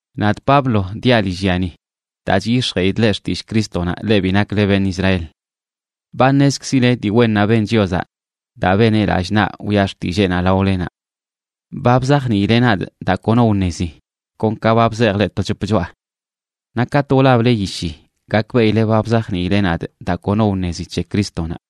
Nadꞌ Pablo diaꞌ lillyani daa chyix̱jeꞌidꞌ leꞌ xtillꞌ Crístonaꞌ, leꞌ bi nakle beṉꞌ Israel. Ba ṉezkzileꞌ dii wennaꞌ ben Chiozaꞌ daa beneꞌ lallꞌ naꞌ wiꞌa xtilleenaꞌ laolenaꞌ. Ba bzajniileꞌ nadꞌ daa kono wṉezi, kon ka ba bzejꞌ leꞌ to c̱hop choꞌa. Naꞌ katꞌ wlable yishi, gakbeꞌile ba bzajniileꞌ nadꞌ daa kono wṉezi c̱he Crístonaꞌ.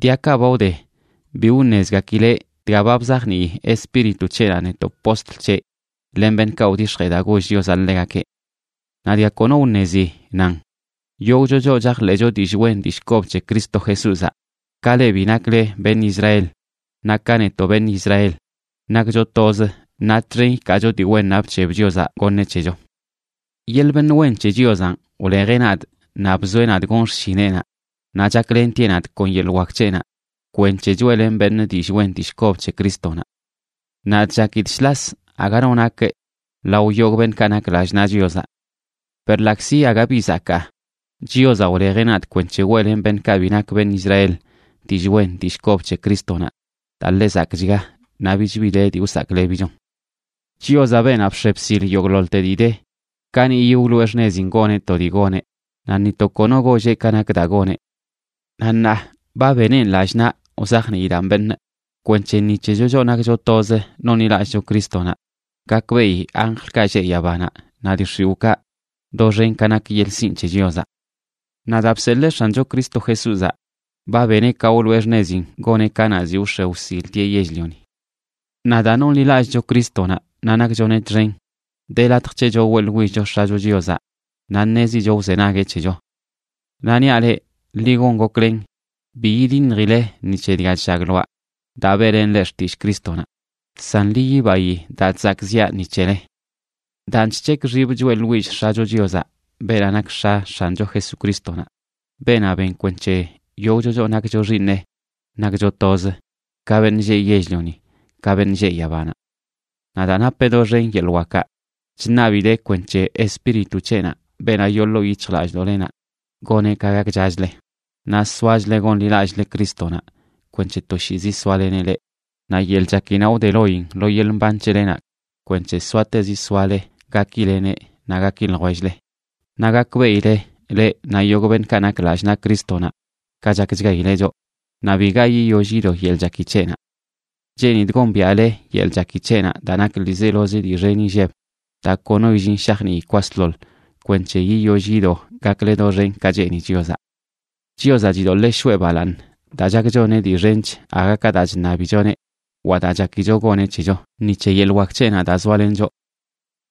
Diakaꞌ ba wde bi wṉezgakileꞌ dga ba bzajnii Espíritu c̱heꞌnaꞌ netoꞌ postl c̱heꞌ len beṉꞌkaꞌ wdix̱jee daa goll Chiozaꞌ ḻegakeꞌ. Naꞌ dga kono wṉezi nan: yogꞌcho choꞌ chajḻeꞌcho dillꞌ wen dillꞌ kob c̱he Cristo Jesúzaꞌ, ka leꞌ bi nakle beṉꞌ Israel naꞌ ka netoꞌ beṉꞌ Israel, nakcho toz naꞌ txen ikaacho dii wennaꞌ bc̱heb Chiozaꞌ goṉeꞌ c̱hecho. Yeḻꞌ beṉꞌ wen c̱he Chiozanꞌ wlejeꞌ nadꞌ naꞌ bzoeꞌ nadꞌ gon xshineꞌnaꞌ, naꞌ chaklentieꞌ nadꞌ kon yeḻꞌ wak c̱heꞌnaꞌ kwenc̱he choeꞌlenꞌ beṉꞌ dillꞌ wen dillꞌ kob c̱he Crístonaꞌ. Nadꞌ chakidꞌ shlas aga no nakꞌ lao yogꞌ beṉꞌ nak lallꞌ naꞌ Chiozaꞌ. Per ḻaꞌkzi aga bi zakaa, Chiozaꞌ wlejeꞌ nadꞌ kwenc̱he weꞌlenꞌ beṉꞌkaꞌ bi nak beṉꞌ Israel dillꞌ wen dillꞌ kob c̱he Crístonaꞌ daa ḻe zakꞌchga naꞌ bich bi de dii wsaklebichon. Chiozaꞌ, beenaꞌ bx̱e bsil yogꞌḻoḻte dii de, kaniꞌyi wloꞌe xṉezin goneꞌ to dii goneꞌ, naꞌ ni to kono golleꞌ ka nak daa goneꞌ. Naꞌ ṉaa ba beneꞌn lallꞌ naꞌ wzajniidaꞌn beṉꞌ kwenc̱he ni c̱hecho, choꞌ nakcho toz nonḻilallꞌcho Crístonaꞌ, gakbeꞌi anjlkaꞌ lleꞌ yabanaꞌ naꞌ dii x̱iwꞌkaꞌ doxen ka nak yeḻꞌ sinꞌ c̱he Chiozaꞌ. Naꞌ daa bseḻee X̱ancho Cristo Jesúzaꞌ, ba beneꞌ ka wloꞌe xṉezin goneꞌ kanaꞌ ziꞌ wx̱e wsiltieꞌ yell-lioni. Naꞌ daa nonḻilallꞌcho Crístonaꞌ naꞌ nakchoneꞌ txen, de latj c̱hecho weꞌḻwillcho X̱acho Chiozaꞌ naꞌ ṉezicho wzenagueꞌ c̱hecho. Naꞌ niaꞌ leꞌ, ḻi gon goklen bi yidiṉjile ni c̱he dga chllagloaꞌ daa beꞌlenꞌ leꞌ xtillꞌ Crístonaꞌ, san ḻi yibayi daa chzakꞌziꞌa ni c̱hele. Daan, chc̱hekꞌ xibꞌ choeꞌḻwillꞌ X̱acho Chiozaꞌ, beenaꞌ nak X̱a X̱ancho Jesucrístonaꞌ, beenaꞌ ben kwenc̱he yogꞌcho choꞌ nakcho xiiṉeꞌ nakcho toz, ka beṉꞌ lleꞌ yell-lioni ka beṉꞌ lleꞌ yabanaꞌ. Naꞌ daa napeꞌ doxen yeḻꞌ wakaꞌ, chṉabidee kwenc̱he Espíritu c̱heꞌnaꞌ, beenaꞌ yoo ḻoo yic̱hjlallꞌdoꞌlenaꞌ, goneꞌ ka gakchachle naꞌ soachle gonḻilallꞌle Crístonaꞌ kwenc̱he toshiizi soaleneꞌ leꞌ, naꞌ yeḻꞌ chakinaꞌ wde loyin lo yeḻꞌ mban c̱helenaꞌ kwenc̱he soatezi soale gakileneꞌ naꞌ gaki ljwell-le, naꞌ gakbeꞌile, leꞌ naꞌ yogꞌ beṉꞌkaꞌ nak lallꞌ naꞌ Crístonaꞌ, ka chakchgaileꞌ choꞌ, naꞌ biga yiyoll yido yeḻꞌ chaki c̱heꞌnaꞌ. Cheenidꞌ gombiaꞌle yeḻꞌ chaki c̱heꞌnaꞌ daa nak ḻiizelozi dii xen inlleb, daa kono illin shajnii kwasḻoḻ, kwenc̱he yiyoll yido gakle doxen ka cheeni Chiozaꞌ. Chiozaꞌ chidoḻee shoꞌe balaaṉ daa chak choneꞌ dii xench aga ka daa chṉabichoneꞌ wa daa chakicho goneꞌ c̱hecho ni c̱he yeḻꞌ wak c̱heꞌnaꞌ daa zoalen choꞌ.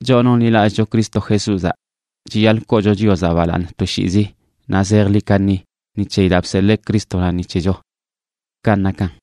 Choꞌ nonḻiꞌlallꞌcho Cristo Jesúzaꞌ chiyaḻꞌ koocho Chiozaꞌ balaaṉ toshiizi naꞌ zejḻi kaṉi ni c̱heyi daa bseḻee Crístonaꞌ ni c̱hecho. Kanꞌ nakan.